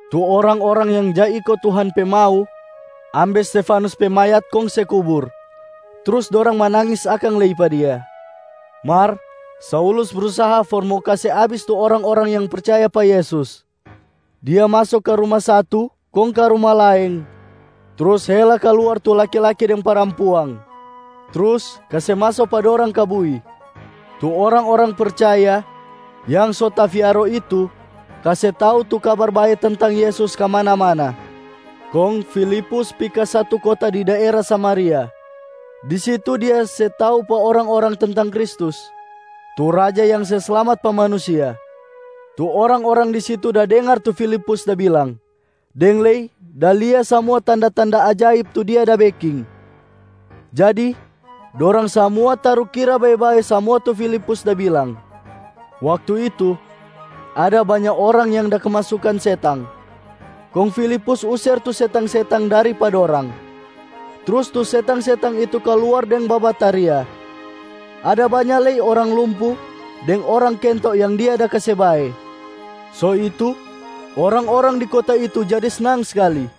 Tu orang-orang yang ja iko Tuhan pe mau ambe Stefanus pe mayat kong se kubur, trus dorang manangis akang lei pa dia. Mar Saulus brusaha for mo kase abis tu orang-orang yang percaya pa Yesus. Dia maso ka ruma satu kong ka ruma laeng trus hela kaluar tu laki-laki deng parampuang, trus kase maso pa dorang ka bui. Tu orang-orang percaya yang so tafiaro itu kase tau tu Kabar Bae tentang Yesus kamana-mana. Kong Filipus pi ka satu kota di daera Samaria. Di situ dia se tau pa orang-orang tentang Kristus, tu Raja yang se slamat pa manusia. Tu orang-orang di situ da dengar tu Filipus da bilang deng lei da lia samua tanda-tanda ajaib tu dia da beking, jadi dorang samua tarukira bae-bae samua tu Filipus da bilang. Waktu itu, ada banya orang yang da kemasukan setang, kong Filipus user tu setang-setang dari pa dorang, trus tu setang-setang itu kaluar deng babataria. Ada banya lei orang lumpu deng orang kento yang dia da kase bae. So itu, orang-orang di kota itu jadi snang skali.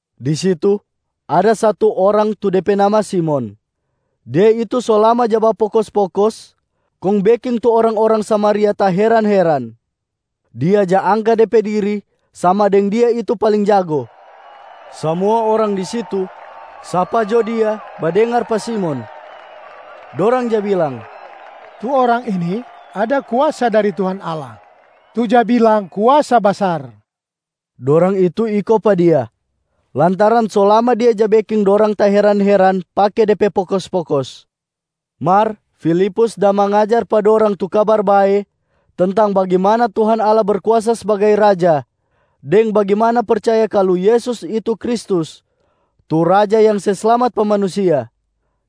Di situ, ada satu orang tu de pe nama Simon. Dia itu so lama ja bapokos-pokos kong beking tu orang-orang Samaria taheran-heran. Dia ja angka de pe diri sama deng dia itu paling jago. Samua orang di situ, sapa jo dia badengar pa Simon. Dorang ja bilang, “Tu orang ini ada kuasa dari Tuhan Allah, tu ja bilang Kuasa Basar.” Dorang itu iko pa dia, lantaran so lama dia ja beking dorang taheran-heran pake de pe pokos-pokos. Mar Filipus da mangajar pa dorang tu Kabar Bae tentang bagimana Tuhan Allah Berkuasa sbagai Raja deng bagimana percaya kalu Yesus itu Kristus tu Raja yang se slamat pa manusia.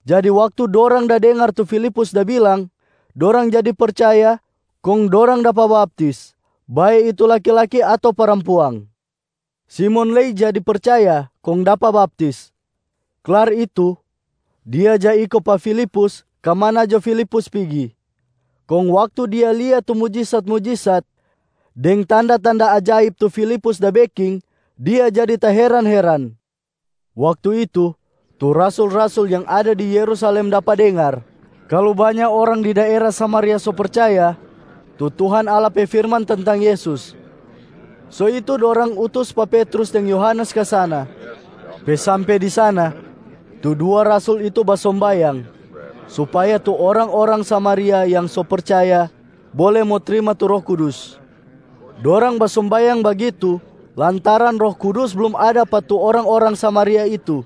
Jadi waktu dorang da dengar tu Filipus da bilang, dorang jadi percaya kong dorang dapa baptis, bae itu laki-laki ato parampuang. Simon lei jadi percaya kong dapa baptis. Klar itu, dia ja iko pa Filipus ka mana jo Filipus pigi. Kong waktu dia lia tu mujisat-mujisat deng tanda-tanda ajaib tu Filipus da beking, dia jadi taheran-heran. Waktu itu, tu rasul-rasul yang ada di Yerusalem dapa dengar kalu banya orang di daera Samaria so percaya tu Tuhan Allah pe firman tentang Yesus. So itu dorang utus pa Petrus deng Yohanes ka sana. Pe sampe di sana, tu dua rasul itu basombayang supaya tu orang-orang Samaria yang so percaya bole mo trima tu Roh Kudus. Dorang basombayang bagitu lantaran Roh Kudus blum ada pa tu orang-orang Samaria itu.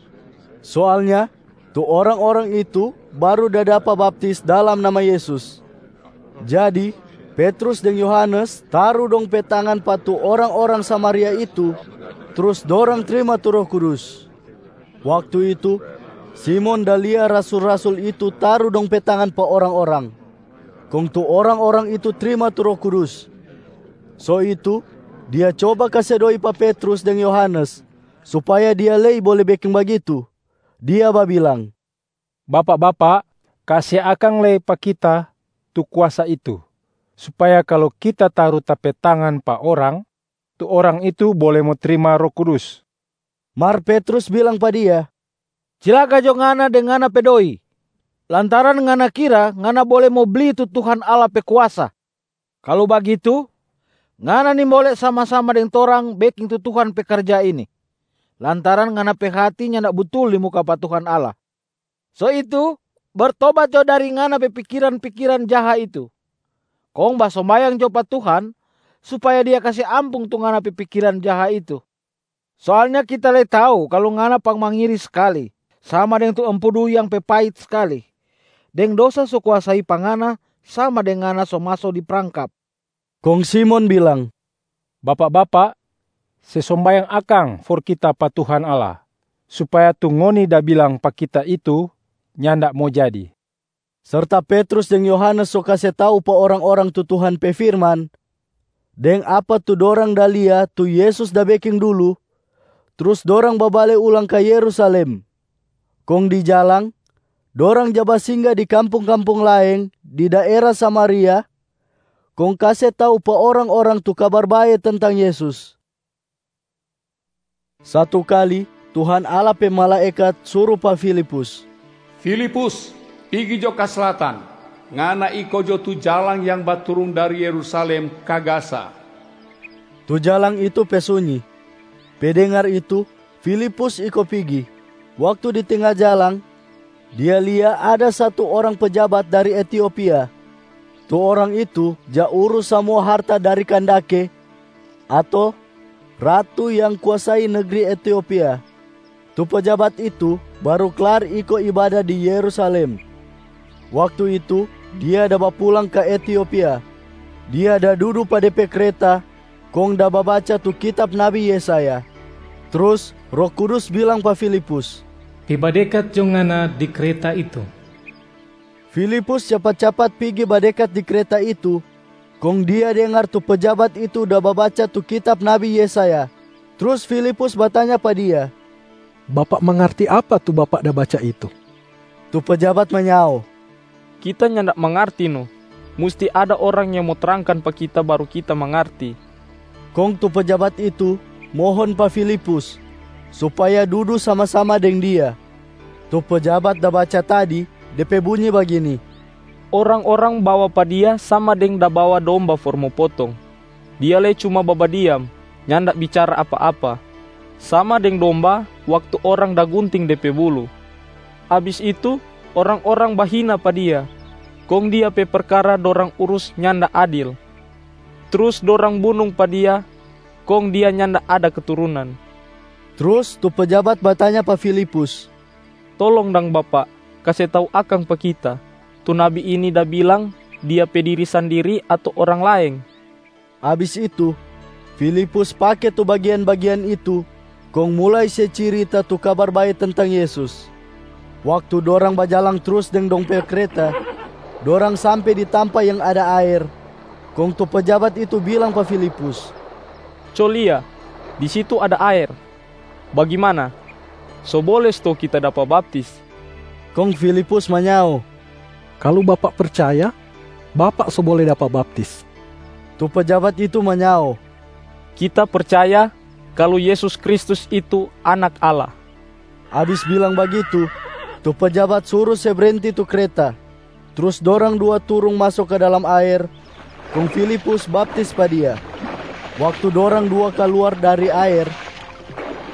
Soalnya tu orang-orang itu baru da dapa baptis dalam nama Yesus. Jadi, Petrus deng Yohanes taru dong pe tangan pa tu orang-orang Samaria itu, trus dorang trima tu Roh Kudus. Waktu itu, Simon da lia rasul-rasul itu taru dong pe tangan pa orang-orang, kong tu orang-orang itu trima tu Roh Kudus. So itu, dia coba kase doi pa Petrus deng Yohanes supaya dia lei bole beking bagitu. Dia babilang, “Bapak-bapak, kase akang lei pa kita tu kuasa itu supaya kalu kita taru ta pe tangan pa orang, tu orang itu bole mo trima Roh Kudus.” Mar Petrus bilang pa dia, “Cilaka jo ngana deng ngana pe doi, lantaran ngana kira ngana bole mo bli tu Tuhan Allah pe kuasa. Kalu bagitu, ngana nimbole sama-sama deng torang beking tu Tuhan pe karja ini, lantaran ngana pe hati nyanda butul di muka pa Tuhan Allah. So itu, bertobat jo dari ngana pe pikiran-pikiran jaha itu, kong basombayang jo pa Tuhan supaya Dia kase ampung tu ngana pe pikiran jaha itu. Soalnya kita lei tau kalu ngana pangmangiri skali sama deng tu empedu yang pe pait skali, deng dosa so kuasai pa ngana sama deng ngana so maso di prangkap.” Kong Simon bilang, “Bapak-bapak, se sombayang akang for kita pa Tuhan Allah, supaya tu ngoni da bilang pa kita itu nyanda mo jadi.” Serta Petrus deng Yohanes so kase tau pa orang-orang tu Tuhan pe firman deng apa tu dorang da lia tu Yesus da beking dulu, trus dorang babale ulang ka Yerusalem. Kong di jalang, dorang ja basingga di kampung-kampung laeng di daera Samaria kong kase tau pa orang-orang tu Kabar Bae tentang Yesus. Satu kali, Tuhan Allah pe malaekat suru pa Filipus, “Filipus, pigi jo ka slatan. Ngana iko jo tu jalang yang baturung dari Yerusalem ka Gaza.” Tu jalang itu pe sunyi. Pe dengar itu, Filipus iko pigi. Waktu di tenga jalang, dia lia ada satu orang pejabat dari Etiopia. Tu orang itu ja urus samua harta dari Kandake ato Ratu yang kuasai negri Etiopia. Tu pejabat itu baru klar iko ibada di Yerusalem. Waktu itu dia da bapulang ka Etiopia. Dia da dudu pa de pe kreta kong da babaca tu kitab nabi Yesaya. Trus Roh Kudus bilang pa Filipus, “Pi badekat jo ngana di kreta itu!” Filipus capat-capat pigi badekat di kreta itu, kong dia dengar tu pejabat itu da babaca tu kitab nabi Yesaya. Trus Filipus batanya pa dia, “Bapak mangarti apa tu bapak da baca itu?” Tu pejabat manyao, “Kita nyanda mangarti no. Musti ada orang yang mo trangkan pa kita baru kita mangarti.” Kong tu pejabat itu mohon pa Filipus supaya dudu sama-sama deng dia. Tu pejabat da baca tadi, de pe bunyi bagini, “Orang-orang bawa pa Dia sama deng da bawa domba for mo potong. Dia lei cuma babadiam, nyanda bicara apa-apa, sama deng domba waktu orang da gunting de pe bulu. Abis itu, orang-orang bahina pa Dia, kong Dia pe perkara dorang urus nyanda adil. Trus dorang bunung pa Dia, kong Dia nyanda ada keturunan.” Trus tu pejabat batanya pa Filipus, “Tolong dang bapak kase tau akang pa kita. Tu nabi ini da bilang dia pe diri sandiri ato orang laeng?” Abis itu, Filipus pake tu bagian-bagian itu kong mulai se cirita tu Kabar Bae tentang Yesus. Waktu dorang bajalang trus deng dong pe kreta, dorang sampe di tampa yang ada aer. Kong tu pejabat itu bilang pa Filipus, “Co lia, di situ ada aer! Bagimana, so bole stou kita dapa baptis?” [ Kong Filipus manyao, “Kalu bapak percaya, bapak so bole dapa baptis.” Tu pejabat itu manyao, “Kita percaya kalu Yesus Kristus itu Anak Allah.”] Abis bilang bagitu, tu pejabat suru se brenti tu kreta. Trus dorang dua turung maso ka dalam aer, kong Filipus baptis pa dia. Waktu dorang dua kaluar dari aer,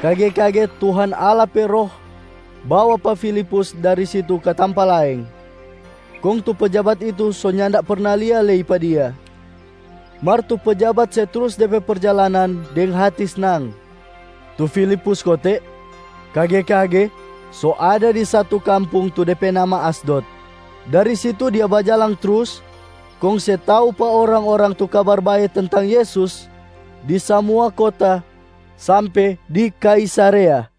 kage-kage Tuhan Allah pe Roh bawa pa Filipus dari situ ka tampa laeng, kong tu pejabat itu so nyanda perna lia lei pa dia. Mar tu pejabat se trus de pe perjalanan deng hati snang. Tu Filipus kote, kage-kage so ada di satu kampung tu de pe nama Asdod. Dari situ dia bajalang trus kong se tau pa orang-orang tu Kabar Bae tentang Yesus di samua kota sampe di Kaisarea.